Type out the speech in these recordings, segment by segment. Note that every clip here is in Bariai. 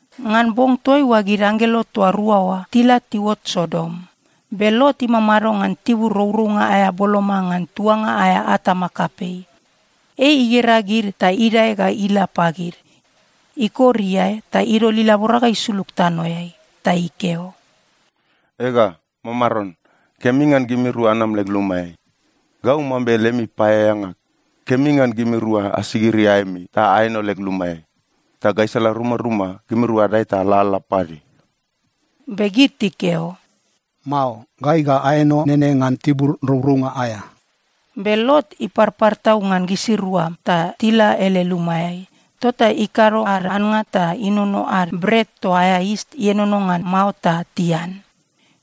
Ngan bong toaiua gid anggelo toa rua oa tila tiuot Sodom. Be Lot imamado ngan tibur rourounga aea boloma ngan tuanga aea atama kapei. Ei igera gid ta idae ga ila pagid. Ikor iae ta idol ilabora ga isulug tanoeai ta ikeo, “Ega, mamaron, kemi ngan gimirua anam leg lumaeai. Gau mambe lemi paeaeanga. Kemi ngan gimirua asigiri aemi ta aeno leg lumaeai. Ta gaisala rumaruma, gimirua adae ta alalala pade.” Be gid tikeo, “Mao. Gai ga aeno nene ngan tibur rourounga aea.” Be Lot iparpar tau ngan gisirua ta tila ele lumaeai. Tota ikado ad annga ta inono ad bret toa aea yis ienono ngan mao, ta tian.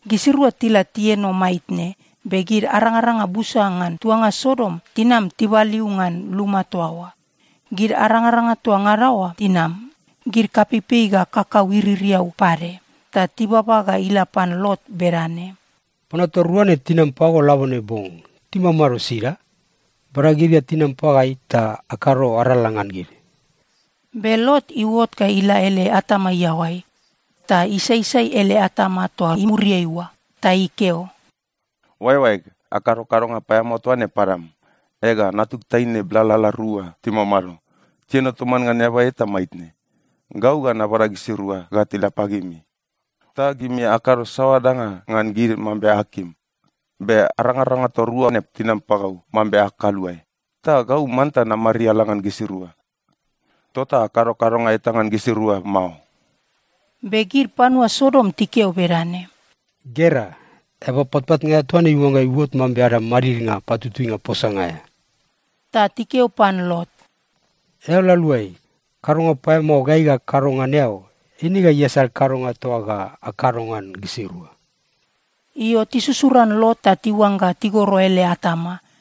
Gisirua tila tieno maitne, be gid arangaranga busa ngan tuanga Sodom tinam tibaliu ngan luma toa oa. Gid arangaranga toa ngada oa tinam, gid kapeipei ga kakau iririau pade. Ta tibaba ga ila pan Lot bedane, “Panua toa rua na tinam pago labone bong, timamado sida? Bada gid ga tinam pagai ta akado arala ngan gid.” Be Lot iuot ga ila ele atama iaoai, ta isaisai ele atama toa imuriai oa, ta ikeo, “Oaeoaeg, akado kadonga paeamao toa ne padam! Ega, natug taine blalala rua timamado, tieno toman ngan eaba eta maitne. Gau ga nabada gisirua ga tila pagimi, ta gimi akado saoa danga ngan gid mambe akim. Be arangaranga toa rua ne tinam pagau mambe ag kaluae. Ta gau manta namariala ngan gisirua. Tota akado kadonga eta ngan gisirua mao.” Be gid panua Sodom tikeo bedane, “Gera. Eaba patpatnga aea toa ne iuangga iuot mambe ada madidnga patutuinga posanga aea!” Ta tikeo pan Lot, “Eao la aluai! Kadonga paeamao gai ga akado ngan eao, eine ga iasal kadonga toa ga akado ngan gisirua.” Io, tisusuran Lot ta tiuangga tigoro ele atama.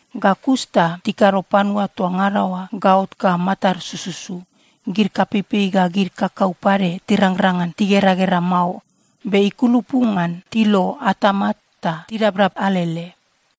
Ga kus ta tikado panua toa ngada oa gaot ga matad sususu. Gid kapeipei ga gid kakau pade tirangrang ngan tigeragera mao be ikulupu ngan tilo atama ta tidabdab alele.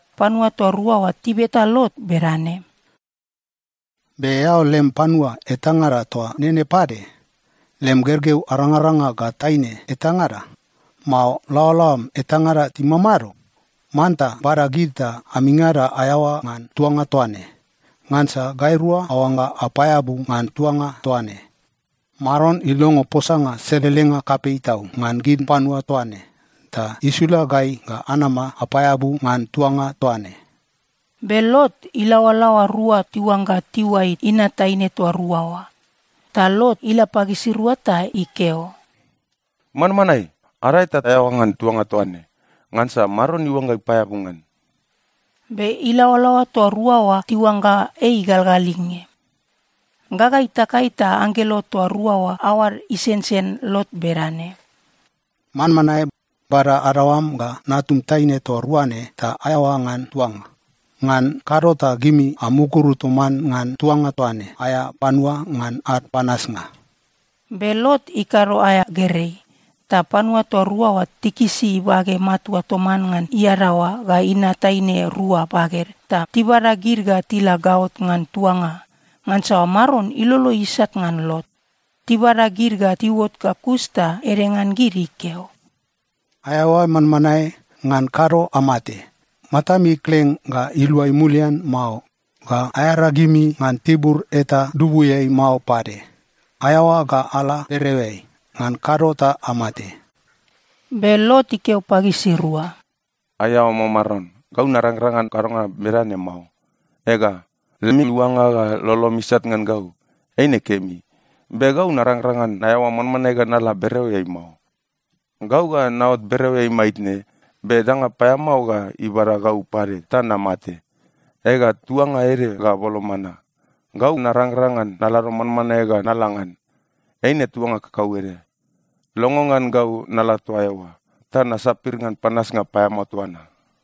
Panua toa rua oa tibeta Lot bedane, “Be eao lem panua etangada toa nene pade? Lem gergeu arangaranga ga taine etangada, mao laoalaoam etangada timamado? Manta bada gid ta amingada aeaoa ngan tuanga toa ne. Ngansa gairua aoangga apaeabu ngan tuanga toa ne. Maron ilongo posanga selelenga kapei tau ngan gid panua toa ne, ta isula gai ga anama apaeabu ngan tuanga toa ne.” Be Lot ilaoalaoa rua tiuangga tiuai inat taine toa rua oa. Ta Lot ila pagisirua ta ikeo, “Manmanae, adae ta aeaoa ngan tuanga toa ne, ngansa Maron iuangga ipaeabu ngan.” Be ilaoalaoa toa rua oa tiuangga ei igalgalinge. Gaga itakai ta anggelo toa rua oa aoad isensen Lot bedane, “Manmanae! Bada adaoam ga natum taine toa rua ne ta aeaoa ngan tuanga. Ngan kado ta gimi amukuru toman ngan tuanga toa ne aea panua ngan ad panasnga.” Be Lot ikado aea gerei. Ta panua toa rua oa tikisi ibage matua toman ngan iadaoa ga inat taine rua baged, ta tibada gid ga tila gaot ngan tuanga, ngansa Maron ilolo isat ngan Lot. Tibada gid ga tiuot ga kus ta ede ngan gid ikeo, “Aeaoa manmanae! Ngan kado amate. Matami kleng ga iluai mulian mao ga aearagimi ngan tibur eta dubuiai mao pade. Aeaoa ga ala bereoeai. Ngan kado ta amate.” Be Lot ikeo pagisirua, “Aiao, mamaron, gau narangrang ngan kadonga bedane mao. Ega, lemi luanga ga lolomi isat ngan gau eine kemi, be gau narangrang ngan naeaoa manmanae ga nala bereoeai mao. Gau ga naot bereoeai maitne, be danga paeamao ga ibada gau pade ta namate. Ega, tuanga ede ga boloma na. Gau narangrang ngan nalado manmanae ga nala ngan. Eine tuanga kakauede. Longo ngan gau nala toa eoa ta nasapir ngan panasnga paeamao toa na.”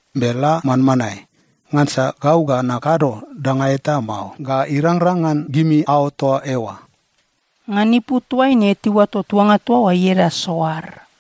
Be la manmanae! Ngansa gau ga nakado danga eta mao, ga irangrang ngan gimi aot toa eoa.” Ngan ipu toaine tiuato tuanga toa oa ieda Soar.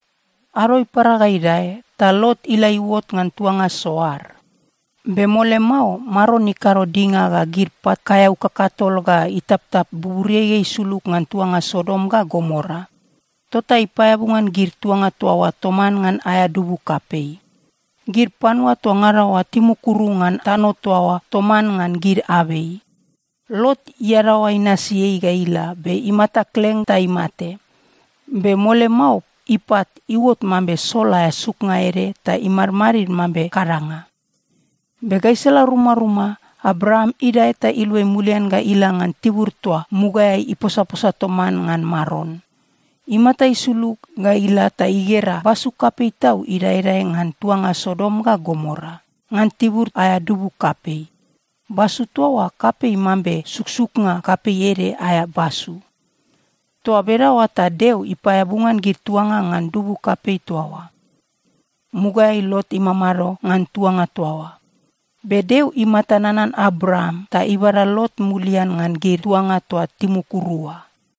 Ado ipara ga idae, ta Lot ila iuot ngan tuanga Soar. Be mole mao, Maron ikado dinga ga gid pat kaeau kakatol ga itaptap buburiai ga isulug ngan tuanga Sodom ga Gomora. Tota ipaeabu ngan gid tuanga toa oa toman ngan aea dubu kapei. Gid panua toa ngada oa timukuru ngan tano toa oa toman ngan gid abei. Lot iadaoa inasi ei ga ila, be imata kleng ta imate. Be mole mao ipat iuot mambe sol aea suknga ede ta imadmadid mambe kadanga. Be gaisala rumaruma, Abraam idae ta iluai mulian ga ila ngan tibur toa mugaeai iposaposa toman ngan Maron. Imata isulug ga ila ta igera basu kapei tau idaedae ngan tuanga Sodom ga Gomora, ngan tibur aea dubu kapei. Basu toa oa kapei mambe suksuknga kapei ede aea basu. Toa bedaoa ta Deo ipaeabu ngan gid tuanga ngan dubu kapei toa oa. Mugaeai Lot imamado ngan tuanga toa oa. Be Deo imata nanan Abraam, ta ibada Lot mulian ngan gid tuanga toa timukuru oa.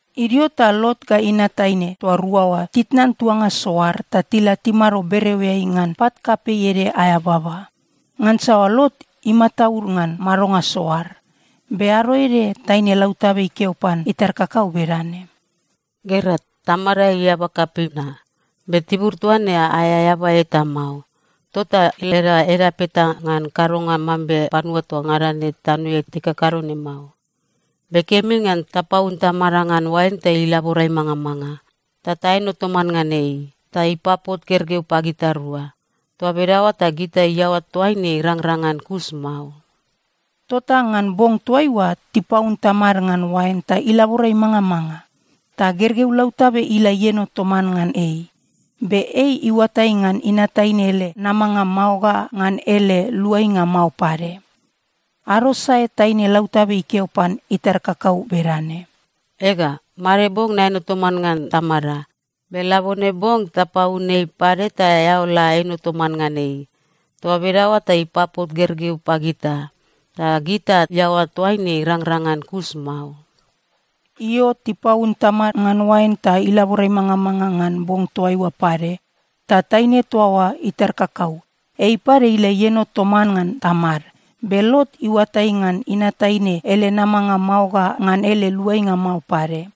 Idio ta Lot ga inat taine toa rua oa titnan tuanga Soar ta tila timado bereoeai ngan pat kapei ede aea baba, ngansa Lot imataud ngan madonga Soar. Be ado ede taine lautabe ikeo pan itar kakau bedane, “Gera. Tamada ei eaba kapei na. Be tibur toa ne aea eaba eta mao. Tota leda edap eta ngan kadonga mambe panua toa ngada ne tanoeai tikakado ne mao. Be kemi ngan tapaun tamada ngan oain ta ilabora imangamanga. Ta taeno toman ngan ei, ta ipapot gergeu pagitarua. Toa bedaoa ta gita iaoa toaine irangrang ngan kus mao.” Tota ngan bong toaiua tipaun tamad ngan oain ta ilabora imangamanga. Ta gergeu lautabe ila ieno toman ngan ei. Be ei iuatai ngan inat taine ele namanga mao ga ngan ele luainga mao pade. Ado sae taine lautabe ikeo pan itar kakau bedane, “Ega, made bong naeno toman ngan tamada. Be labone bong tapaun ei pade ta eao la eno toman ngan ei. Toa bedaoa ta ipapot gergeu pagita, ta gita iaoa toaine irangrang ngan kus mao.” Io, tipaun tamad ngan oain ta ilabora imangamanga ngan bong toaiua pade. Ta taine toa oa itar kakau, ei pade ila ieno toman ngan tamad. Be Lot iuatai ngan inat taine ele namanga mao ga ngan ele luainga mao pade.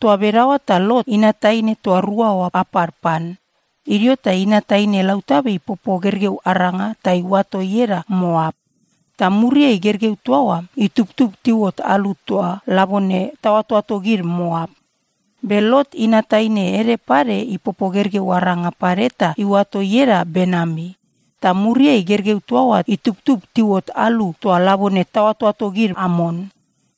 Toa bedaoa ta Lot inat taine toa rua oa apad pan. Idio ta inat taine lautabe ipopo gergeu aranga ta iuato ieda Moap. Ta muriai gergeu toa oa itubtub tiuot alu toa labone taoatoato gid Moap. Be Lot inat taine ede pade ipopo gergeu aranga pade ta iuato ieda Benami. Ta muriai gergeu toa oa itubtub tiuot alu toa labone taoatoato gid Amon.